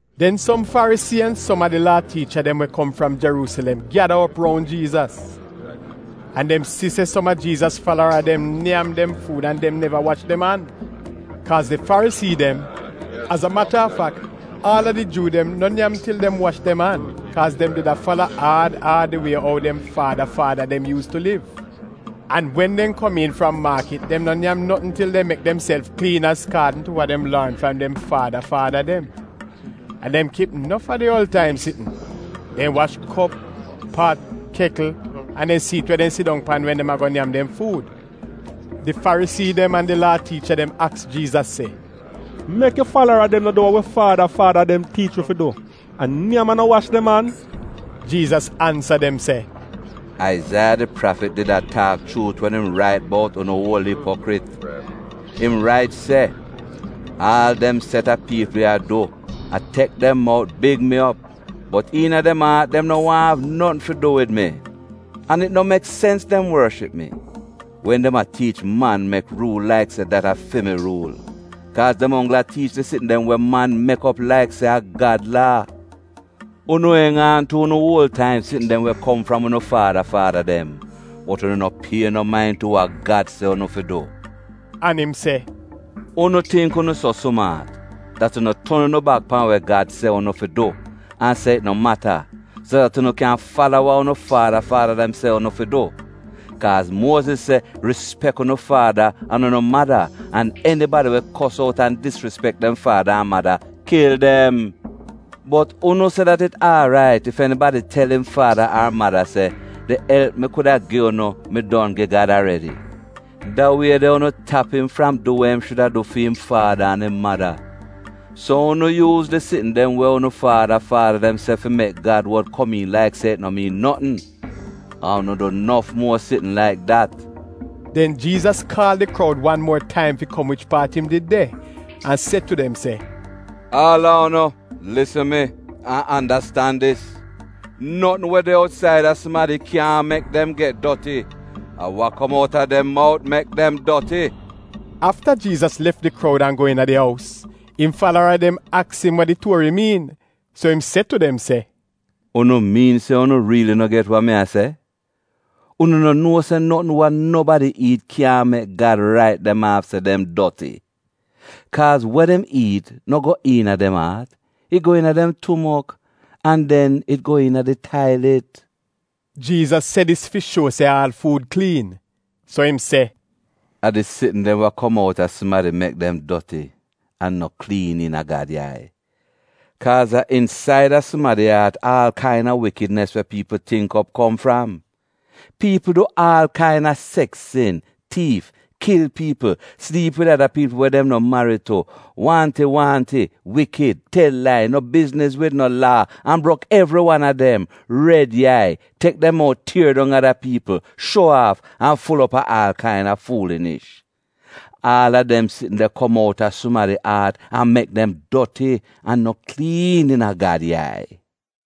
Den som Farisii an som a di Laa tiicha dem we kom fram Jeruusilem gyada op roun Jiizas. An dem si se som a Jiizas falara dem nyam dem fuud an dem neva wash dem an. Kaaz di Farisii dem, az a mata a fak, aal a di Juu dem, no nyam til dem wash dem an kaaz dem did fala aad aad di wie ou dem faada faada dem yuus tu liv. An wen dem komiin fram maakit dem no nyam notn til dem mek demself kliin azkaadn tu wa dem lorn fram dem faada faada dem. An dem kip nof ada uol taim sitn: dem wash kop, pat, kekl an dem siit we dem sidong pan wen dem a go nyam dem fuud. Di Farisii dem an di Laa tiicha dem aks Jiizas se, “Mek yu falara dem no du wa wi faada faada dem tiich wi fi du — a nyam an no wash dem an?” Jiizas ansa dem se, “Aizaiya di prafit did a taak chuut wen im rait bout unu uol ipokrit. Im rait se, “ ‘Aal dem set a piipl ya du a tek dem mout big mi op, bot iina dem aat dem no waahn av notn fi du wid mi. An it no mek sens dem worship mi, wen dem a tiich man-mek ruul laik se dat a fi mi ruul, kaaz dem onggl a tiich di sitn dem wa man mek op laik se a Gad Laa.’ Unu enj aan tu unu uol taim sitn dem we kom fram unu faada faada dem, bot unu no pie no main tu wa Gad se unu fi du.” An im se, “Unu tingk unu so sumaat dat unu ton unu bak pan we Gad se unu fi du an se it no mata, so dat unu kyan fala wa unu faada faada dem se unu fi du. Kaaz Muoziz se, ‘Rispek unu faada an unu mada,’ an, ‘Enibadi we kos out an disrispek dem faada an mada, kil dem.’ Bot unu se dat it aarait ef enibadi tel im faada ar mada se, ‘Di elp mi kuda gi unu mi don gi Gad aredi.’ Da wie de unu tap im fram du wa im shuda du fi'im faada an im mada. So unu yuuz di sitn dem we unu faada faada dem se, fi mek Gad wod komiin laik se it no miin notn. An unu du nof muo sitn laik dat.” Den Jiizas kaal di kroud wan muo taim fi kom wich paat im did de an se tu dem se, “Aal a unu lisn mi, an andastan dis: Notn we de outsaida sumadi kyaahn mek dem get doti, a wa kom out a dem mout mek dem doti.” Afta Jiizas lef di kroud an go iina di ous, im falara dem aks im wa di tuori miin. So im se tu dem se, “Unu miin se unu riili no get wa mi a se? Unu no nuo se notn wa nobadi iit kyaahn mek Gad rait dem aaf se dem doti? Kaaz wa dem iit no go iina dem aat, it go iina dem tumok an den it go iina di tailit.” (Jiizas se dis fi shuo se aal fuud kliin.) So im se, “A di sitn dem wa kom outa sumadi mek dem doti an no kliin iina Gad yai. Kaaz a insaida sumadi aat aal kaina wikidnis we piipl tingk op kom fram. Piipl du aal kaina seks sin, tiif, kil piipl, sliip wid ada piipl we dem no marid tu, waahnti-waahnti, wikid, tel lai, no bizniz wid no laa an brok evri wan a dem, red yai, tek dem mout tier dong ada piipl, shuo aaf, an ful op a aal kaina fuulinish. Aal a dem sitn de kom outa sumadi aat an mek dem doti an no kliin iina Gad yai.”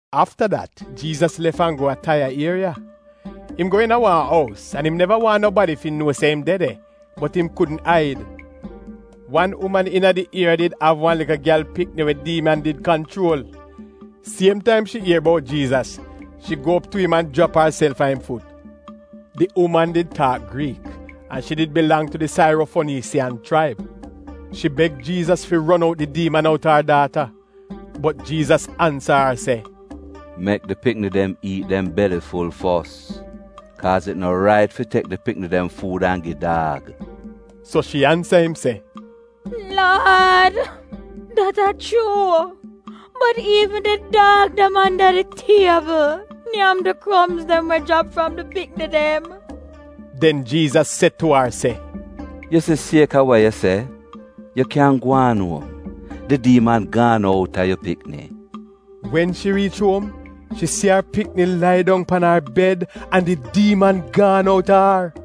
Afta dat Jiizas lef an go a Taiya ieriya. Im go iina wan ous, an im neva waahn nobadi fi nuo se im de de, bot im kudn aid. Wan uman iina di ieriya did av wan likl gyal pikni we diiman did kanchuol. Siem taim shi ier bout Jiizas, shi go tu im an jrap arself a im fut. Di uman did taak Griik, an shi did bilang tu di Sairofoniisiyan chraib. Shi beg Jiizas fi ron out di diiman outa ar daata. Bot Jiizas ansa ar se, “Mek di pikni dem iit dem beli ful fos. Kaaz it no rait fi tek di pikni dem fuud an gi daag.” So shi ansa im se, “Laad dat a chuu, bot iivn di daag dem anda di tiebl nyam di kromz dem we jrap fram di pikni dem.” Den Jiizas se tu ar se, “Yu si sieka wa yu se, yu kyan gwaan uom, di diiman gaan outa yu pikni.” Wen shi riich uom shi si ar pikni lai dong pan ar bed an di diiman gaan outa ar.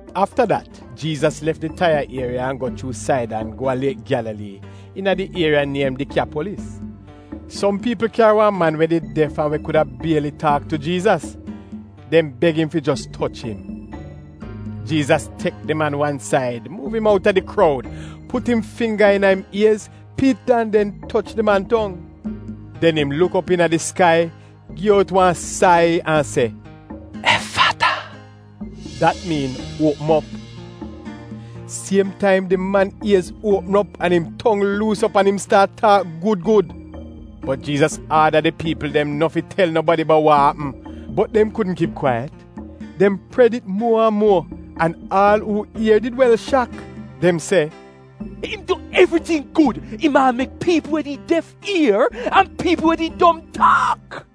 Afta dat Jiizas lef di Taiya ieriya an go chuu Saidan go a Liek Gyalalii iina di ieriya niem Dikyapolis. Som piipl kyari wan man we did def an we kuda bieli taak tu Jiizas. Dem beg im fi jos toch im. Jiizas tek di man wan said, muuv im outa di kroud, put im fingga iina im iez, pit an den toch di man tong. Den im luk op iina di skai, gi out wan sai an se, “Ef - fata!” (Dat miin, “Uopm op!”). Siem taim di man iez uopm op an im tong luus op an im staat taak gud gud. Bot Jiizas aada di piipl dem no fi tel nobadi bout wa apm, bot dem kudn kip kwaiyat, dem pred it muo an muo. An aal uu ier did wel shak. Dem se, “Im du evriting gud! Im aal mek piipl we did def ier, an piipl we did dom taak.”